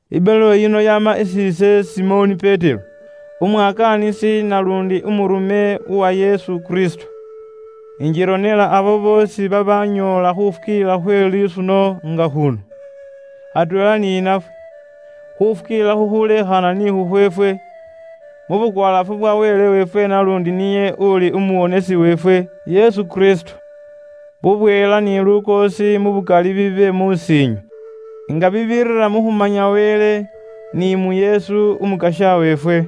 Ibaluwa yino yaama isi ise Simoni Petero, umwakaanisi naluundi umurume uwa Yesu Kristo. Ingironela abo boosi babanyoola khufukiilila khwe lisuno nga khuno, atweela ni nafwe. Khufukiilila khukhuleekhaana ni khukhweefwe, mu bukwalaafu bwa Wele weefwe naluundi niye uli umuwonesi weefwe, Yesu Kristo. Bubweela ni lukoosi mu bukali bibe mus'iinywe, nga bibirira mu khumanya Wele, ni mu Yesu Umukasya weefwe.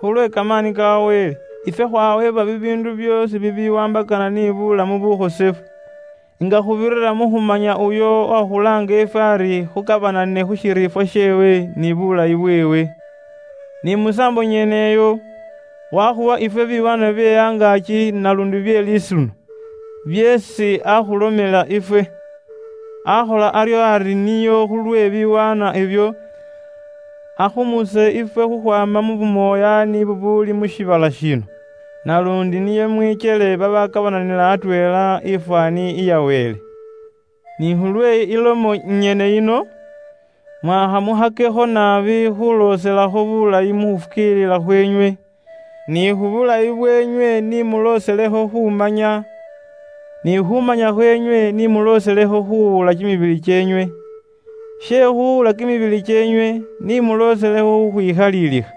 Khulwe kamaani ka Wele, ifwe khwaweebwa bibiindu byoosi bibiwaambakana ni buulamu bukhosefu, nga khuubirira mu khumanya uyo uwakhulaanga ifwe ari khukabanane khu shiriifwa sheewe ni buulayi bweewe. Ni musaambo nyene iyo, waakhuwa ifwe biwaanwa bye angaaki naluundi bye lisuno, byeesi aakhulomela ifwe. Aakhola aryo ari nio khulwe biwaanwa ibyo, akhumuse ifwe khukhwaama mu bumoyaani bubuuli mu shiibala shino. Naluundi nio mwikyele babakabananila atweela ifwaani iya Wele. Ni khulwe ilomo inyene yino, mwaakha mukhakekho naabi khuulooselakho buulayi mu khufukiilila khweenywe. Ni khu bulayi bweenywe ni mulooselekho khuumanya, ni khuumanya khweenywe ni mulooselekho khuuwula kimibili kyeenywe. She khuuwula kimibili kyeenywe, ni mulooselekho khukhwikhaliilikha,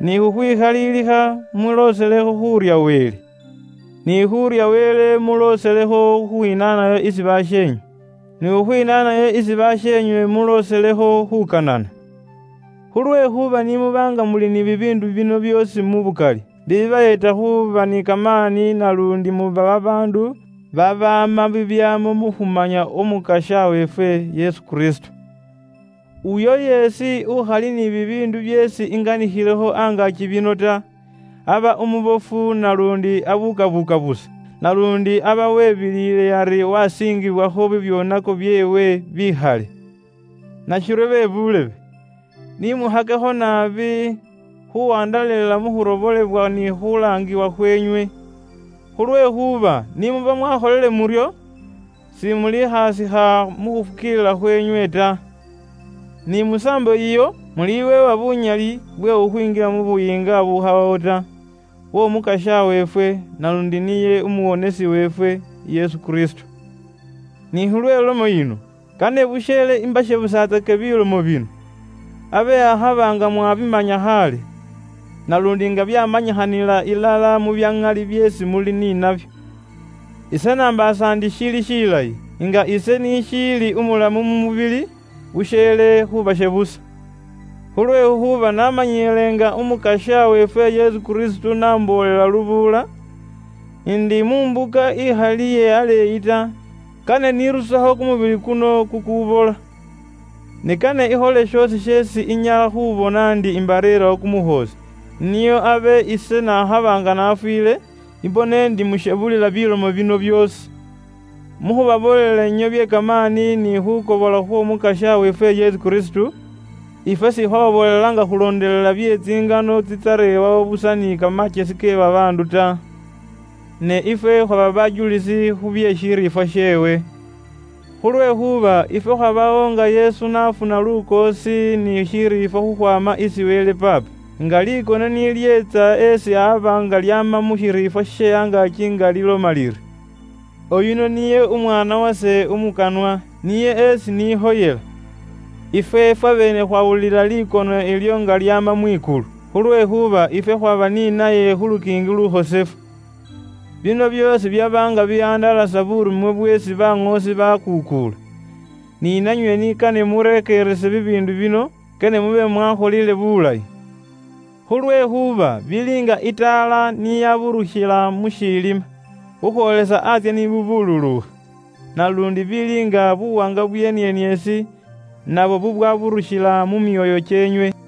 ni khukhwikhaliilikha mulooselekho khuurya Wele. Ni khu khurya Wele mulooselekho khukhwinaanayo isi basheenywe, ni khukhwinaanayo isi basheenywe mulooselekho khuukanana. Khulwekhuuba ni muba nga muli ni bibiindu bino byoosi mu bukali, bibayeeta khuuba ni kamaani naluundi muba babaandu babaama bibyaamo mu khumanya Umukasya weefwe, Yesu Kristo. Uyo yeesi ukhali ni bibiindu byeesi inganikhilekho angaaki bino ta, aba umubofu naluundi abuukabuuka busa. Naluundi aba webiliile ari waasiingibwakho bibyoonako byeewe bikhale. Nashiryo be buulebe, ni mukhakekho naabi khuuwandalalila mu khurobolebwa ni khuulaangibwa khweenywe. Khulwekhuuba ni muba mwaakholile muryo, simulikhaasikha mu khufukiilila khweenywe ta. Ni musaambo iyo, muliweebwa buunyali bwe khukhwinjila mu buyiinga bubukhawawo ta, bw'Omukasya weefwe, naluundi niye Umuwonesi weefwe, Yesu Kristo. Ni khulwe lomo yino, kane busheele imbashebusatsake bilomo bino, abe akhaba nga mwaabimanya khaale, naluundi nga byaamanyikhanila ilala mu bya ŋali byeesi muli ni nabyo. Ise nambaasa ndi shili shilayi, nga ise nishiili umulamu mu mubili, busheele khubashebusa. Khulwekhuuba namanyile nga Umukasya weefwe Yesu Kristo n'amboolela ise lubuula, ndi mu mbuka ikhali iye aleeyi ta, kane nirusekho kumubili kuno kukubola. Ne kane ikhole shoosi sheesi inyala khubona ndi imbareerawo kumukhoosi, nio abe ise nakhaba nga nafwiile, imbone ndi mushebulila bilomo bino byoosi. Mu khubaboolela inywe bye kamaani ni khuukobola khw'Omukasya weefwe Yesu Kristo, ifwe sikhwababoolela nga khulondelela bye tsingano tsitsarewawo busa ni kamakyesi ke babaandu ta. Ne ifwe khwaba bajulisi khu bye shiriifwa sheewe. Khulwekhuuba ifwe khwabawo nga Yesu n'afuna lukoosi ni shiriifwa khukhwaama isi Wele Paapa. Nga likono ni lyeetsa esi aba nga lyama mu shiriifwa she angaaki nga liloma liri, “Uyuno niye umwaana wase umukanwa; niye esi nikhoyela.” Ifwe fwabeene khwawulila likono ilyo nga lyama mwikulu, khulwekhuuba ifwe khwaba ni naye khu lukiingi lukhosefu. Bino byoosi byaba nga bihandalasa buurume bweesi baŋoosi baakuukuula. Ni nanywe ni kane murekeerese bibiindu bino, kane mube mwakholile bulayi. Khulwekhuuba bili nga itaala ni yaburukhila mu shiilima, khukhwoolisa antsye ni bubuluukha. Naluundi bili nga buwaanga bwe inieniesi nabwo bubwaburushila mu myoyo kyeenywe.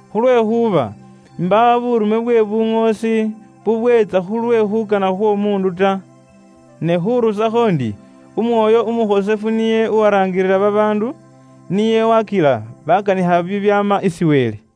Khulwekhuuba imbaawo buurume bwe buŋoosi bubweetsa khulwe khuukana khw'omuundu ta. Ne khuurusakho ndi Umwoyo Umukhosefu niye uwaraangilila babaandu nio waakila baakanikha bibyaama isi Wele.